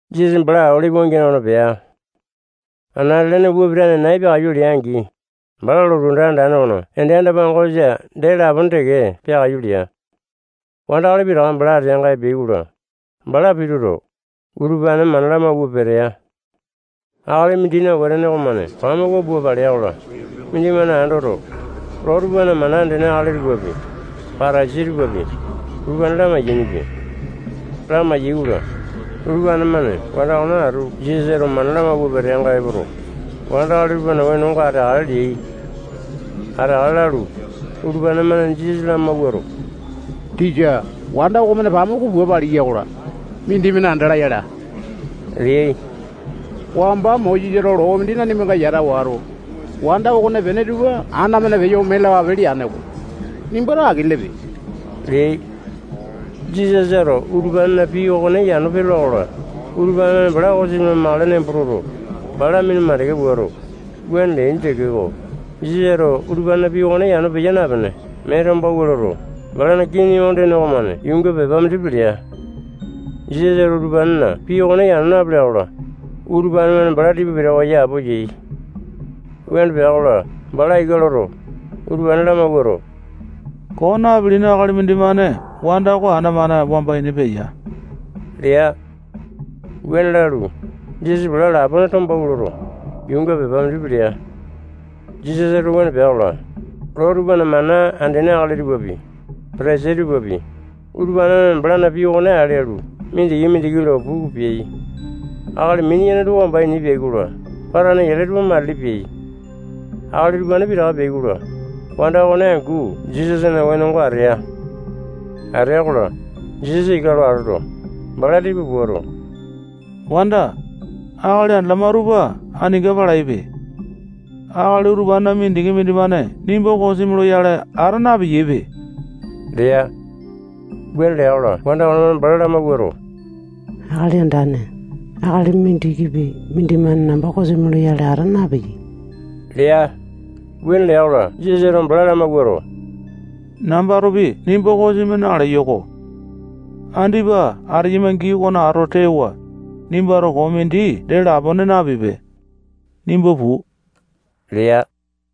[Jisasa bala Olipi wangiane okona pea. Anate-lene upa pitane nai peakaiyu lea-angi, bala lotu anda andane okona ende anda-pangosa dee lapone teke peakaiyu lea. Wandakali pitaka bala ateanga epeai-kola, bala pituto, utupane mana lamauwa petea. Akali mindina wetene okomane pamuku pua palea-kola, mindimane andoto, loo tupana mana andene akali tupapi, Patasai tupapi, utupane lamai-yainipia. Lamai-yaikola, utupane-mane wanda okone atu Jisasa mana lamawua peteanga epoto, wandakali tupana wenonga ateakale leai. Ateakale lalu, utupane-mane Jisasa lamawuato, tisa, wanda okomane pamuku pua paliya-kola, mindimane andala yala leai. Wamba Mosesato loo mindi nanimanga yata wato, wanda okonepene tupa ana-mane peyo ome lalapape leane-ko. Nimbato aki lelepe leai. Jisasato utupanena pii okone yano peyola-kola, utupane-mane bala kosimi lamakale nembo toto, bala minu mandeke puato, wuane leaini tekeko, Jisasato utupanena pii okone yano peya napene, mee tombawua loto, balana kii ondene okomane yuunga pepa mindi pelea. Jisasato utupanena pii okone yano napelea-kola, utupane-mane bala tipa pitawa yapo yai. Wuane pea-kola, bala ika loto, utupane lamawuato, koo napilini akali mindimane wanda oko ana-mane wamba ini peya lea. Wuane lalu, Jisasa bala lapone tombawua loto, yuunga pepa mindi pelea. Jisasato wuane lea-kola, loo tupana mana andene akali tupapi, Patasai tupapi, utupane-mane balana pii okone ale alu, mindiki-mindiki lo puku peai. Akali mini-yene tupa wamba ini peai-kola, patane yale tupa matili peai. Akali utupane pitaka peai-kola, wanda okone angu Jisasana wenonga atea. Atea-kola, Jisasa ika lo atoto, bala tipa puato, wanda, akali andalama tupa aninga palaipe. Akali utupanena mindiki mindimane nimba kosimi loyale ata napeyaipe lea. Wuane lea-kola, wanda okonemane bala lamawuato, Akali Andane, akali mindikipi mindimane namba kosimi loyale ata napeyai lea. Wuane lea-kola, Jisasato bala lamawuato, nambatopi nimba kosimi naleyo-ko. Andipa ateyama gii okona atoto tewa, nimbato koo mindi dee lapone napipe. Nimba puu lea.]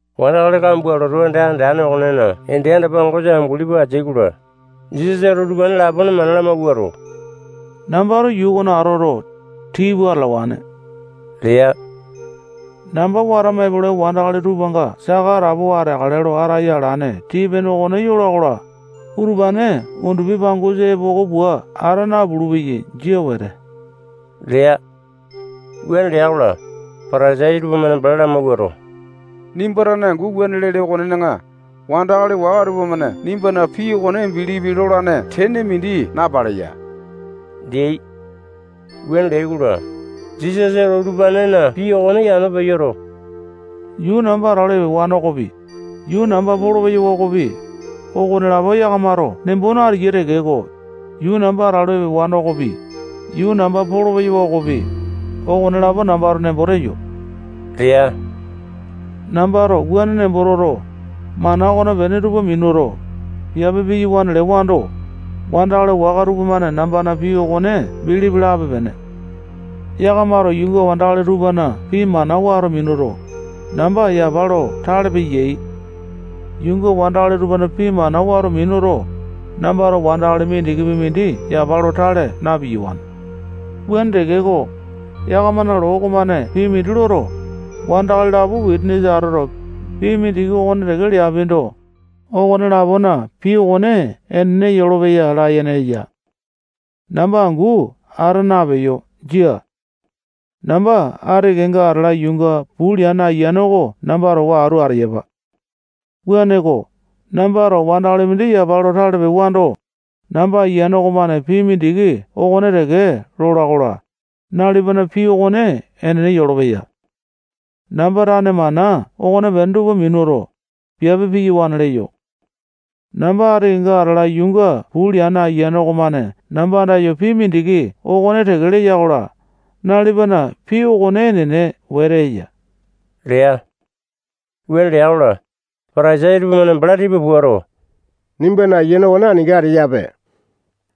Wandakali kambua lotu anda andane okonena ende anda-pangosa amunguli pua ateai-kola, Jisasato utupane lapone mana lamawuato, nambato yuu okona atoto, tii pua atalawane lea. Namba watama epolai wandakali tupanga saka atapowa ateakale lo ataya alane tii-pene okone yola-kola, utupane undupi pangosa epoko pua ata napulu-peyai. Jia wete lea. Wuane lea-kola, Patasai tupamane bala lamawuato, nimba tane angu wuane lele okonena, wandakali waka tupamane nimbana pii okone bilipi lolane tene mindi napaleya leai. Wuane leai-kola, Jisasato utupanena pii okone yano peyoto, yuu namba atalu epewane okopi, yuu namba polopeyawa okopi, okonelapo yakamato nembo nateyai tekeko, yuu namba atalu epewane okopi, yuu namba polopeyawa okopi, okonelapo nambato nembo teyo lea. Nambato wuane nembo toto, mana okopene tupa minuto, piape piyawane lewando, wandakali waka tupamane nambana pii okone bilipi lape-pene. Yakamato yuunga wandakali tupana pii mana wato minuto, namba yapa lo tale peyai. Yuunga wandakali tupana pii mana wato minuto, nambato wandakali mindikipi mindi yapa lo tale na-piyawane. Wuane tekeko, yakamana loo okomane pii mindi loto, wandakali lapo wisanisa atoto, pii mindiki okone teke leapindo, okone-lapona pii okone enene yolopeya layene eya. Namba angu ata napeyo. Jia. Namba ati kenga atala yuunga puu leane Ayiane oko namba towa atu ateyapa. Wuaneko, nambato wandakali mindi yapa lo tale pewando, namba Ayiane okomane pii mindiki okone teke lola-kola, nalipana pii okone enene yolopeya. Namba tane mana okopene tupa minuto, piape piyawane leyo. Namba ati kenga atala yuunga puu leane Ayiane okomane namba andayo pii mindiki okone teke leya-kola, nalipana pii okone enene wete eya lea. Wuane lea-kola, Patasai tupamane bala tipa puato, nimbana Ayiane okone aninga ateyape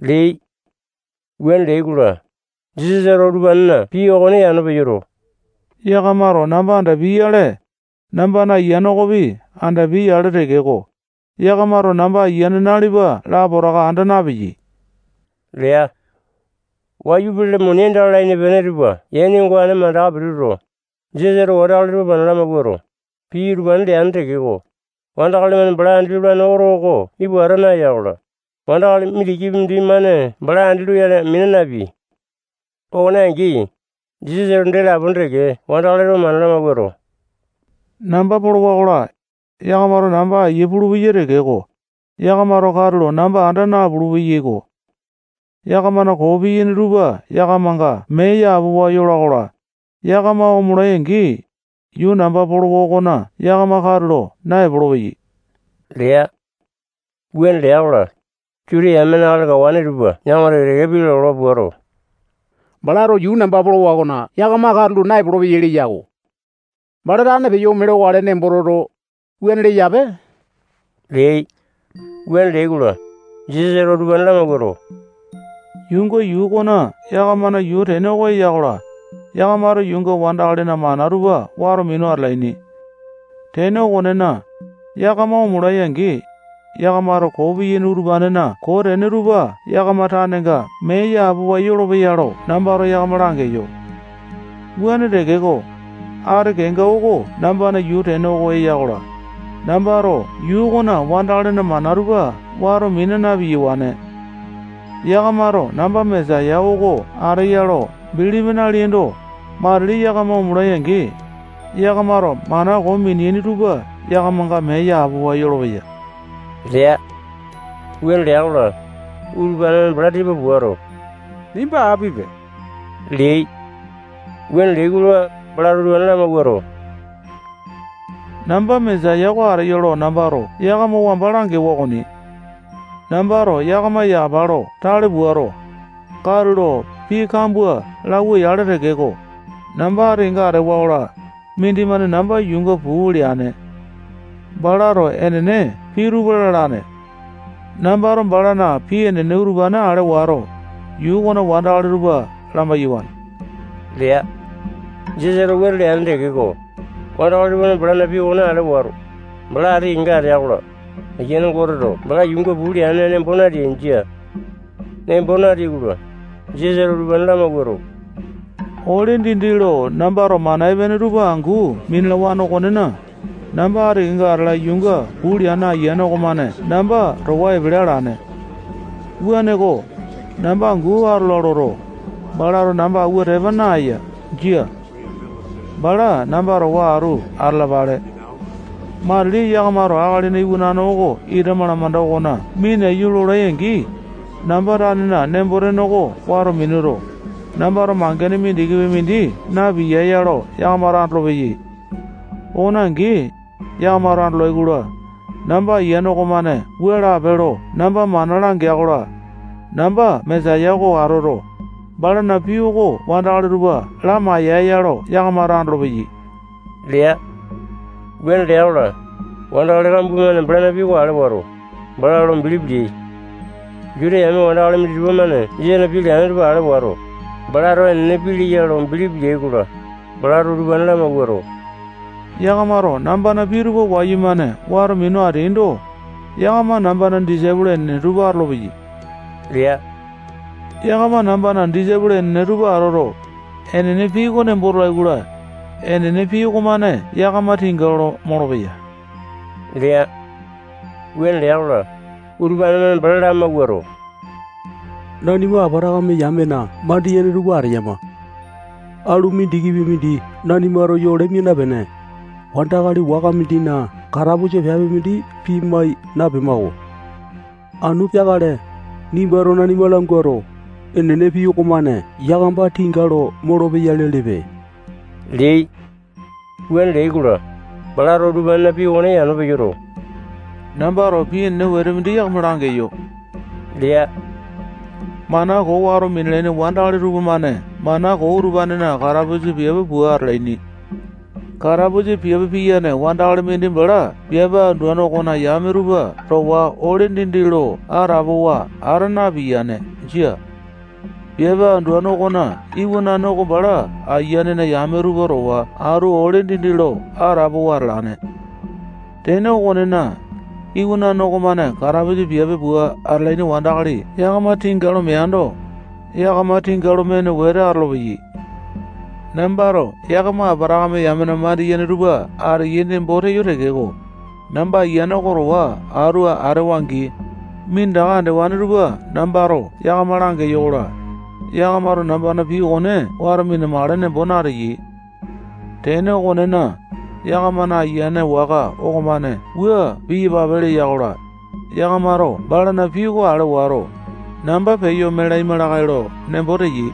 leai. Wuane leai-kola, Jisasato utupanena pii okone yano peyoto, yakamato namba andapiai-yale, nambana Ayiane okopi andapiai-yale tekeko, yakamato namba Ayiane nalipa lapotaka anda napeyai lea. Wayu pele muni aindaka lalaini pene tupa yaini ongane mandaka pituto, Jisasato wandakali tupa mana lamawuato, pii utupane leane tekeko, wandakali-mane bala andi lolane oto oko ipu ata naya-kola, wandakali mindikipi mindimane bala andi loyale mina napeai. Okone angi, Jisasato dee lapone teke wandakali tupa mana lamawuato, namba polowa-kola, yakamato namba aiya pulupeyai tekeko, yakamato katulo namba anda napulu-peyaiko. Yakamana koo piyaini tupa yakamanga mee yapowa yola-kola, yakama omolai-angi, yuu namba polowa okona yakama katulo naepolo-peyai lea. Wuane lea-kola, Juta yamena akali kawane tupa yakama teke-teke pii lalawa puato, balato yuu namba polowa okona yakama katulo naepolo-peyai leya-ko. Bala tane peyo ome lokale nembo toto, wuane leyape leai. Wuane leai-kola, Jisasato utupane lamawuato, yuunga yuu oko yakamana yuu tene oko eya-kola, yakamato yuunga wandakalina mana tupa wato minu atalaini. Tene okonena, yakama omolai-angi, yakamato koo piyaini utupanena koo tene tupa yakama tanenga mee yapowa yolopeya lo nambato yakama langeyo. Wuane tekeko, ati kenga oko nambana yuu tene oko eya-kola, nambato yuu okona wandakalina mana tupa wato mina na-piyawane. Yakamato namba Mesaya oko ateya lo bilipi naleaindo, matili yakama omolai-angi, yakamato mana koo mineaini tupa yakamanga mee yapowa yolopeya lea. Wuane lea-kola, utupane-mane bala tipa puato, nimba apipe leai. Wuane leai-kola, balato utupane lamawuato, namba Mesaya oko ateyo lo nambato yakama wamba langewa okoni. Nambato yakama yapa lo tale puato, katulo pii kambua lauwa-yale tekeko, namba ati kenga atewa-kola, mindimane namba yuunga puu leane. Balato enene pii tupa lalane. Nambato balana pii enene utupane ale wato, yuu okona wandakali tupa lamai-yawane lea. Jisasato wuane leane tekeko, wandakali tupamane balana pii okone ale wato, bala ati kenga atea-kola, Aiyane Goteto bala yuunga puu leane nembo nateai. Jia. Nembo nateai-kola, Jisasato utupane lamawuato, ole dindi lo nambato mana epene tupa angu minalawane okonena, namba ati kenga atala yuunga puu leane Ayiane okomane namba towa epele alane. Wuaneko, namba angu atola loto, balato namba awua tepa naya. Jia. Bala namba towa atu atalapale. Matili yakamato Akalina Iwanane oko ita malamanda okona minaiyu lolai-angi, namba tanena nembo-tene oko wato minuto, nambato mangene mindikipi mindi na-piyaeya lo yakamato andolopeyai. Okone angi, yakamato andolai-kola, namba Ayiane okomane wua lape lo namba mana langeya-kola, namba Mesaya oko atoto, balana pii oko wandakali tupa lamai-yaeya lo yakamato andolopeyai lea. Wuane lea-kola, wandakali kambua-mane balana pii oko ale wato, bala lo bilipi leai. Juta yame wandakali minditupa-mane Jisasana pii leane tupa ale wato, balato enene pii leya lo bilipi leai-kola, balato utupane lamawuato, yakamato nambana pii tupa wayumane wato minu ateaindo, yakama nambana disaipolo enene tupa atolopeyai lea. Yakama nambana disaipolo enene tupa atoto, enene pii oko nembo tolai-kola, enene pii okomane yakama tinga lo molopeya lea. Wuane lea-kola, utupane-mane bala lamawuato, nanima Apatakame yamena mandiyene tupa ateyama. Alu mindikipi mindi nanimato yole mia napene, wandakali waka mindina katapusa piape mindi pimai napema-ko. Anu peakale, nimbato nanima languato, enene pii okomane yakama tinga lo molopeya lelepe leai. Wuane leai-kola, balato utupanena pii okone yano peyoto, nambato pii enene wete mindi yakama langeyo lea. Mana koo wato minalaini wandakali tupamane mana koo utupanena katapusa piape pua atalaini. Katapusa piape piyane wandakali mindi bala piape anduane okona yame tupa towa ole dindi lo atapowa ata napiyane. Jia. Piape anduane okona iwanane oko bala ayianena yame tupa towa atu ole dindi lo atapowa atalane. Tene okonena, Iwanane okomane katapusa piape pua atalaini wandakali yakama tinga lo meando, yakama tinga lo mene wete atolopeyai. Nambato yakama Apatakame yamena mandiyene tupa ateyai nembo teyo tekeko, namba Ayiane oko towa atu atewa-angi, minditaka andewane tupa nambato yakama langeyo-kola, yakamato nambana pii okone wato mina-makale nembo nateyai. Tene okonena, yakamana ayiane waka okomane wua piyapape leya-kola, yakamato balana pii oko ale wato, namba peyo ome laima lakae lo nembo teyai.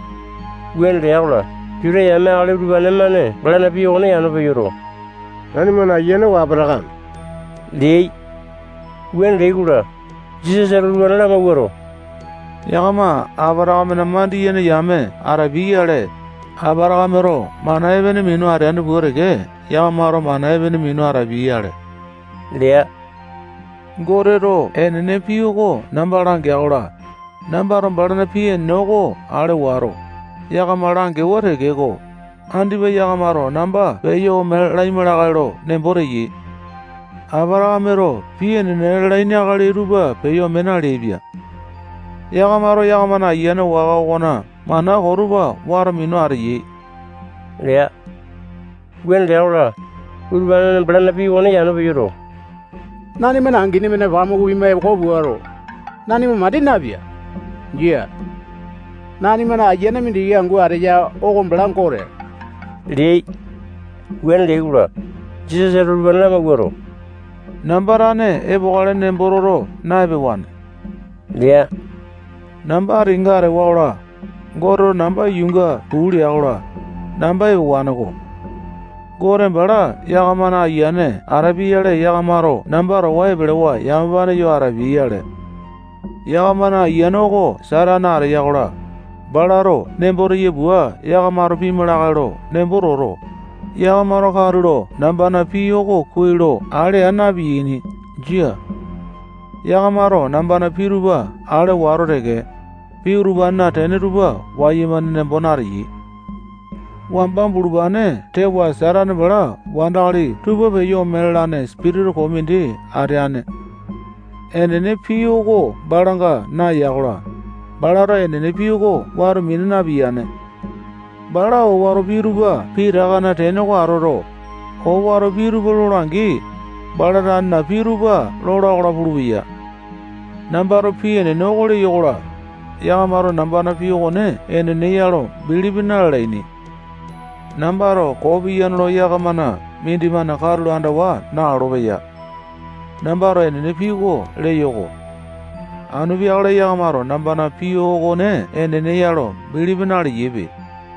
Wuane lea-kola, Juta yame akali utupane-mane balana pii okone yano peyoto, nanimana ayiane oko Apatakame leai. Wuane leai-kola, Jisasato utupane lamawuato, yakama Apatakamena mandiyene yame atapia-yale, Apatakameto mana epene minu ateane pua teke yakamato mana epene minu atapiai-yale lea. Goteto enene pii oko namba langea-kola, nambato balana pii enene okone ale wato, yakama langewa tekeko, andipa yakamato namba peyo ome laima lakae lo nembo teyai. Apatakameto pii enene lalaini akali tupa peyo ome naleaipia. Yakamato yakama ayiane waka okona mana koo tupa wato minu ateyai lea. Wuane lea-kola, utupane-mane balana pii okone yano peyoto, nanimana angini-mane pamuku pima epoko puato, nanima mandi napea. Jia. Nanimana Ayiane mindiki angu ateya oko bala Gote leai. Wuane leai-kola, Jisasato utupane lamawuato, namba tane epokale nembo toto na-epewane lea. Namba ati kenga atewa-kola, Goteto namba yuunga puu lea-kola, namba epewane-ko. Gote bala yakamana ayiane atapia-yale, yakamato namba towa epelewa yamapane yo atapiai-yale. Yakamana ayiane oko Satane ateya-kola, balato nembo teya pua yakamato pima lakae lo nembo toto, yakamato katulo nambana pii oko kuai lo ale aa na-piyaini. Jia. Yakamato nambana pii tupa ale wato teke, pii utupanena tene tupa wayumane nembo nateyai. Wamba bulupane tewa Satane bala wandakali tupa peyo ome lalane sipitisa koo mindi ateane. Enene pii oko balanga naeya-kola, balato enene pii oko wato mina napiyane. Bala owato pii tupa pitakana tene oko atoto, owato pii tupa lola-angi, bala tanena pii tupa lola-kola pulupeya. Nambato pii enene oko leyo-kola, yakamato nambana pii okone enene ya lo bilipi na-lalaini. Nambato koo piyane lo yakamana mindimane katulo andawa nalolo-peyape. Nambato enene pii oko leyo-ko. Anu peakale yakamato nambana pii okone enene ya lo bilipi naleyaipe.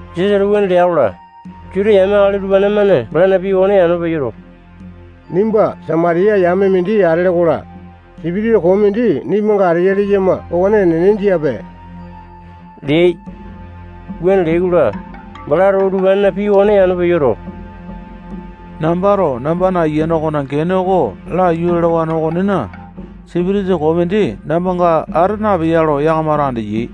Jisasato wuane lea-kola, Juta yame akali utupane-mane balana pii okone yano peyoto, nimba Samatiya yame mindi atele-kola, sipitisa koo mindi nimbanga ateya leyama okone enene jiape leai. Wuane leai-kola, balato utupanena pii okone yano peyoto, nambato nambana Ayiane okona gene oko laiyu lalawane okonena, sipitisa koo mindi nambanga ata napeya lo yakamato andeyai.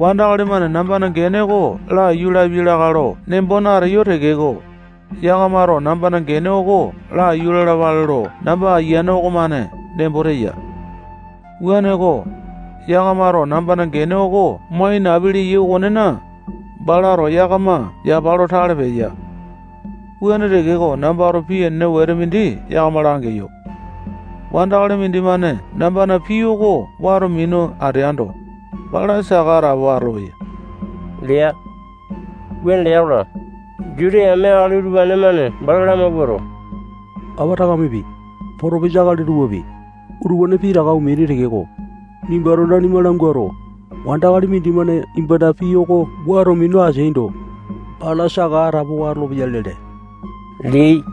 Wandakali-mane nambana gene oko laiyu lapiai lakae lo nembo nateyo tekeko, yakamato nambana gene oko laiyu lalapale lo namba Ayiane okomane nembo teya. Wuaneko, yakamato nambana gene oko mo ainapi leyai okonena, balato yakama yapa lo tale peya. Wuane tekeko, nambato pii enene wete mindi yakama langeyo. Wandakali mindimane nambana pii oko wato minu ateando, bala saka atapowa atolopeya lea. Wuane lea-kola, Juta yame akali utupane-mane bala lamawuato, Apatakamepi, potopisa akali tupapi, utupane pitaka omeaini tekeko, nimbato nanima languato, wandakali mindimane nimbana pii oko wato minu ateaindo, bala saka atapowa atolopeya lele leai.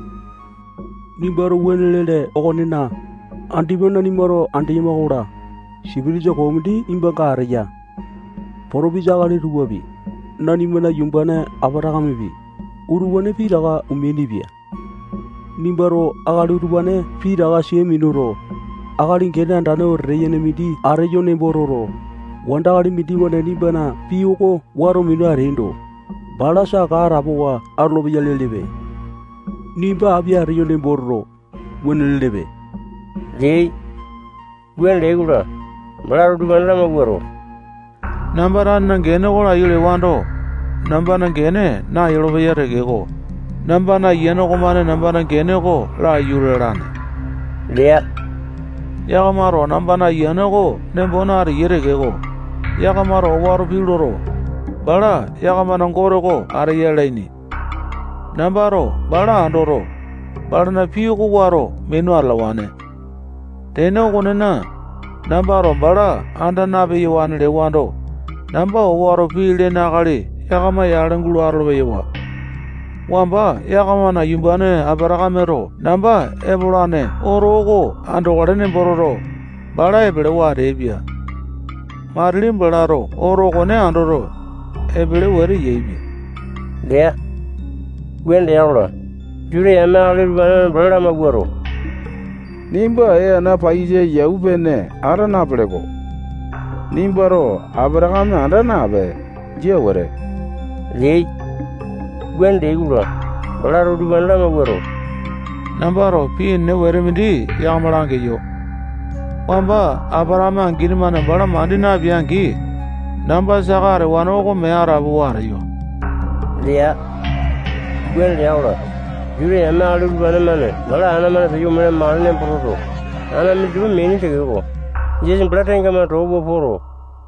Nimbato wuane lele okonena, andipa nanimato andeyama-kola, sipitisa koo mindi nimbanga ateya. Potopisa akali tupapi, nanimana yumbane Apatakamepi, utupane pitaka omeainipia. Nimbato akali utupane pitaka sia minuto, akali gene andane wetete yene mindi ateyo nembo toto, wandakali mindimane nimbana pii oko wato minu ateaindo, bala saka atapowa atolopeya lelepe. Nimba api ateyo nembo toto, wuane lelepe leai. Wuane leai-kola, balato utupane lamawuato, namba tanena gene oko laiyu lewando, nambana gene nayolopeya tekeko, namba Ayiane okomane nambana gene oko laiyu lalane lea. Yakamato nambana Ayiane oko nembo nateyai tekeko, yakamato owato pii loto, bala yakamana Gote oko ateya lalaini. Nambato bala andoto, balana pii oko wato minu atalawane. Tene okonena, nambato bala anda na-peyawane lewando, namba owato pii lene akali yakama yale gulo atolo-peyawa. Wamba yakamana yumbane Apatakameto namba epolane oto oko andokale nembo toto, bala epelewa ateaipia. Matili balato oto okone andoto, epele wete yaepia lea. Wuane lea-kola, Juta yame akali utupane-mane bala lamawuato, nimba ee ana paiyasa yau pene ata napele-ko. Nimbato Apatakame anda napee. Jia wete leai. Wuane leai-kola, balato utupane lamawuato, nambato pii enene wete mindi yakama langeyo. Wamba Apatakame angini-mane bala mandi napea-angi, namba saka atewane oko mee atapowa ateyo lea. Wuane lea-kola, Juta yame akali utupane-mane bala ana-mane peyo ome lamakale nembo toto, ana minditupa meaini tekeko, Jisasa bala tengamane too pua poto,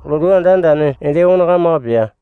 lotu anda andane ende okona kamaka pea.